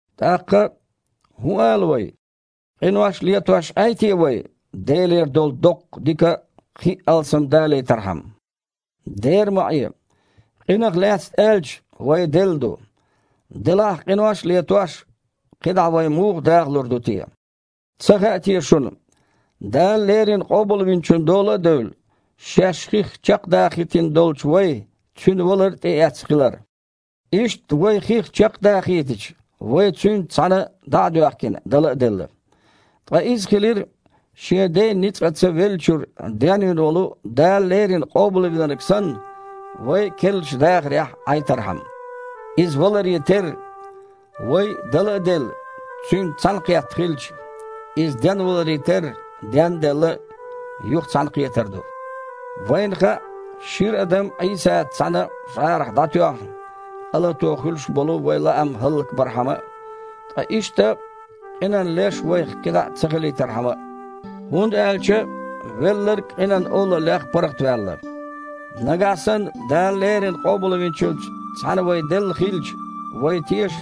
ТІаккха, хІун ала вай? Къинош а летош Іей те вай, Делера долу доккха дика кхин а алсамдалийтархьама? Дера ма Іе! Къинах лаьцна аьлча, вай делла ду. Делахь, къинош а летош, кхидІа вай муха дахалур ду те? Ца хаьа те шуна, Дала леррина Къобалвинчун дола а девлла, шаьш хих чекхдахийтина долчу вай Цуьнан валар а тІеэцна хилар? Иштта, вай хих чекхдахийтича, вай Цуьнца цхьаьна дІа а доьхкина, дала а делла. Ткъа иза хилира, Шен Ден ницкъаца веллачуьра денвина волу Дала леррина Къобалвинарг санна, вай а керлачу дахарехь Іайтархьама. Иза валаре терра, вай, дала а делла, Цуьнца цхьаьнакхетта хилча, Иза денваларе терра, ден а делла, юха цхьаьнакхетар ду. Вайна хаьа, шира адам Іийсаца цхьаьна жІарах дІатоьхна, къа лато хуьлуш болу вайн лаам хІаллакбархьама а, ткъа иштта къинан леш вайх кхидІа ца хилийтархьама а, хІунда аьлча велларг къинан олаллех паргІатваьлла. Нагахь санна Дала леррина Къобалвинчуьнца цхьаьна вай делла хилча, вай теша,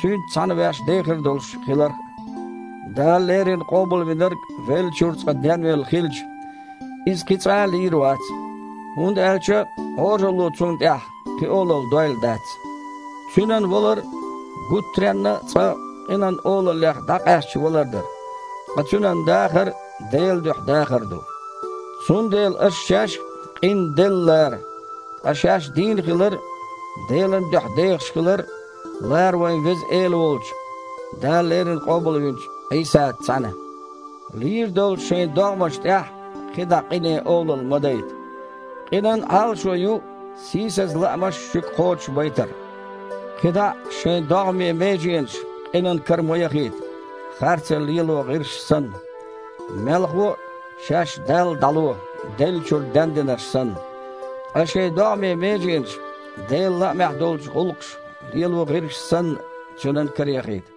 Цуьнца цхьаьна ваьш дехар долуш хиларх а. Дала леррина Къобалвинарг веллачуьра цкъа денвелла хилча, иза кхин цкъа а лийр вац, хІунда аьлча Іожалло Цунна тІехь кхин олалла дойла дац. Цуьнан валар гуттаренна а цкъа къинан олаллех дІакъаьсташ валар дара, ткъа Цуьнан дахар Делан дуьхьа дахар ду. Цундела аша шаьш а къинна делла лара. Ткъа шаьш дийна хилар – Делан дуьхьа дехаш хилар лара вайн Веза Эла волчу, Дала леррина къобалвинчу Іийсаца цхьаьна. Лийр долчу шайн догІмашна тІехь кхидІа къине олалла ма дайта. Къинан Іалашо ю сийсаза лаамаш шуьга кхочушбайтар. КхидІа а шайн догІмийн меженаш къинан кара ма яхийта, харцо лело гІирсаш санна. Мелхо а, шаьш Далла дІало, деллачуьра дендинарш санна. Ткъа шайн догІмийн меженаш, Делан лаамехь долчу гІуллакхаша лело гІирсаш санна, Цуьнан караяхийта.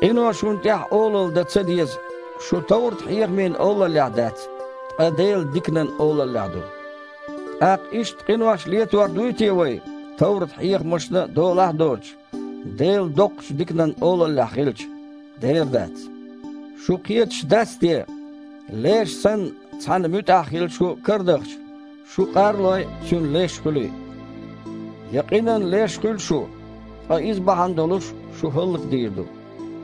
Къино шуна тІехь олалла дан ца деза: шу товрат-хьехамийн олаллехь дац, ткъа Делан диканан олаллехь ду. ТІаккха иштта къинош летор дуй те вай, товрат-хьехамашна долахь а доцуш, Делан доккхачу диканан олаллехь хилча? Дера дац! Шу кхеташ дац те, леш санна цхьанна муьтІахь хила шу карадахча, шу къар а лой, цуьнан леш хуьлий? Я къинан леш хуьлу шу, ткъа иза бахьана долуш шу хІаллакдийр ду,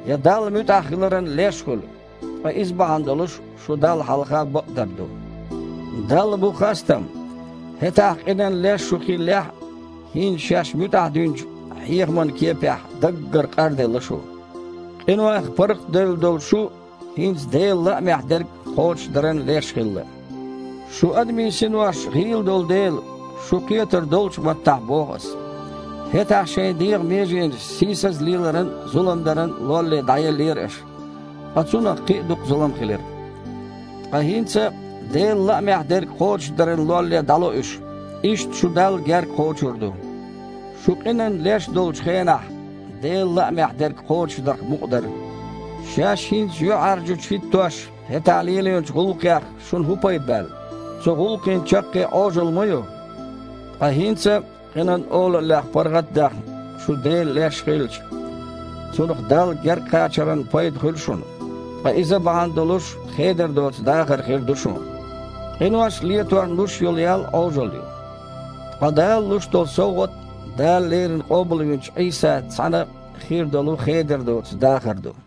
я Далла муьтІахь хиларан леш хуьлу, ткъа иза бахьана долуш шу Далла хьалха бакъдар ду. Далла бу хастам! ХІетахь къинан леш шу хиллехь а, хІинца шаьш муьтІахь динчу хьехаман кепехь даггара къарделла шу. Къинойх паргІатдевлла долу шу, хІинца Делан лаамехь дерг кхочушдаран леш хилла. Шун адамийн синош гІийла долу дела, шу кхетар доллучу маттахь боху ас. ХІетахь шайн дегІан меженаш сийсаза леларан а, зулам даран а лолле дІаеллера аша, ткъа цунах кхин а дукха зулам хилира. Ткъа хІинца Делан лаамехь дерг кхочушдаран лолле дІало уьш, иштта шу Далла герга кхочур ду. Шу къинан леш долчу хенахь, Делан лаамехь дерг кхочушдарх мукъа дара. Шаьш хІинца юьхьІаьржачу хІиттош, хІетахь лелийначу гІуллакхех шуна хІун пайда баьлла? Цу гІуллакхийн чаккхе Іожалла ма ю! Ткъа хІинца, къинан олаллех паргІат а даьхна, шу Делан леш хилча, цунах Далла гергакхачаран пайда хуьлу шуна, ткъа иза бахьана долуш хедар доцу дахар хир ду шун. Къинош леторна луш йолу ял Іожалла ю, ткъа Дала луш долу совгІат Дала леррина къобалвинчу Іийсаца цхьаьна хир долу хедар доцу дахар ду.